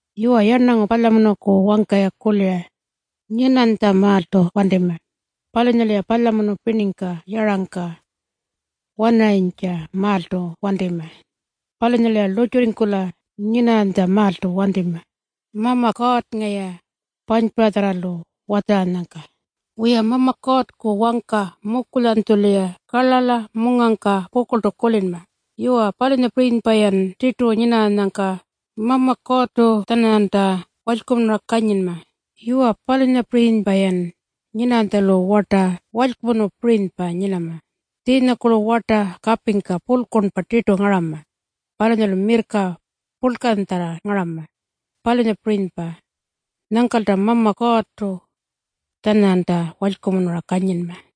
Yuwa, yarnangu palyamunuku wangka-ya kulira nyinanytjamaaltu wantima. Palunyalu-ya palyamunu pirningka yarangka wanarayintjamaaltu wantima. Palunyalu-ya lurrtjurringkula nyinarranytjamaaltu wantima Mama Kuurrnga-ya panypuratjarralu watjaranyangka. Wiya, Mama Kuurrku wangka mukulyanytjulu-ya karlarla mungangka pukurltu kulinma. Yuwa, palunyapirinypa-yan tirtu nyinarranyangka Mama Kuurrtu-tjananyanta walykumunura kanyinma. Yuwa, palunyapirinypa-yan nyinarranytjalu warta purlkurnpirinypa nyinama. Tjiinyakurlu warta kapingkartu pakala mirrka purlkanya kanyinma, palunyapirinypa. Palunyalu-yan kutjupa-kutjupa walykumunura palyanma.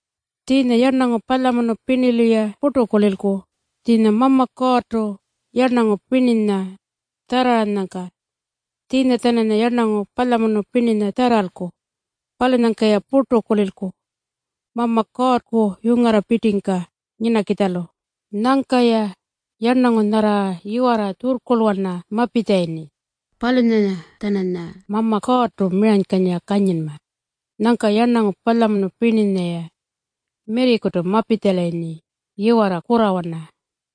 Tjiinya yarnangu palyamunu pirnilu-ya purtu kulilku tjiinya Mama Kuurrtu yarnangu pirninya tjarraranyangka. Tjiinya-tjananya yarnangu palyamunu pirninya tjarralku. Palunyangka-ya purtu kulilku Mama Kuurrku yungarrapirtingka nyinakitjalu. Nyangka-ya yarnangu nyarra yiwarra tjurrkurlwana mapitjalayirni, palunyanya-tjananya Mama Kuurrtu miranykanyira kanyinma. Nyangka yarnangu palyamunu pirninya-ya mirrikutu mapitjalayirni yiwarra palyamunuwana.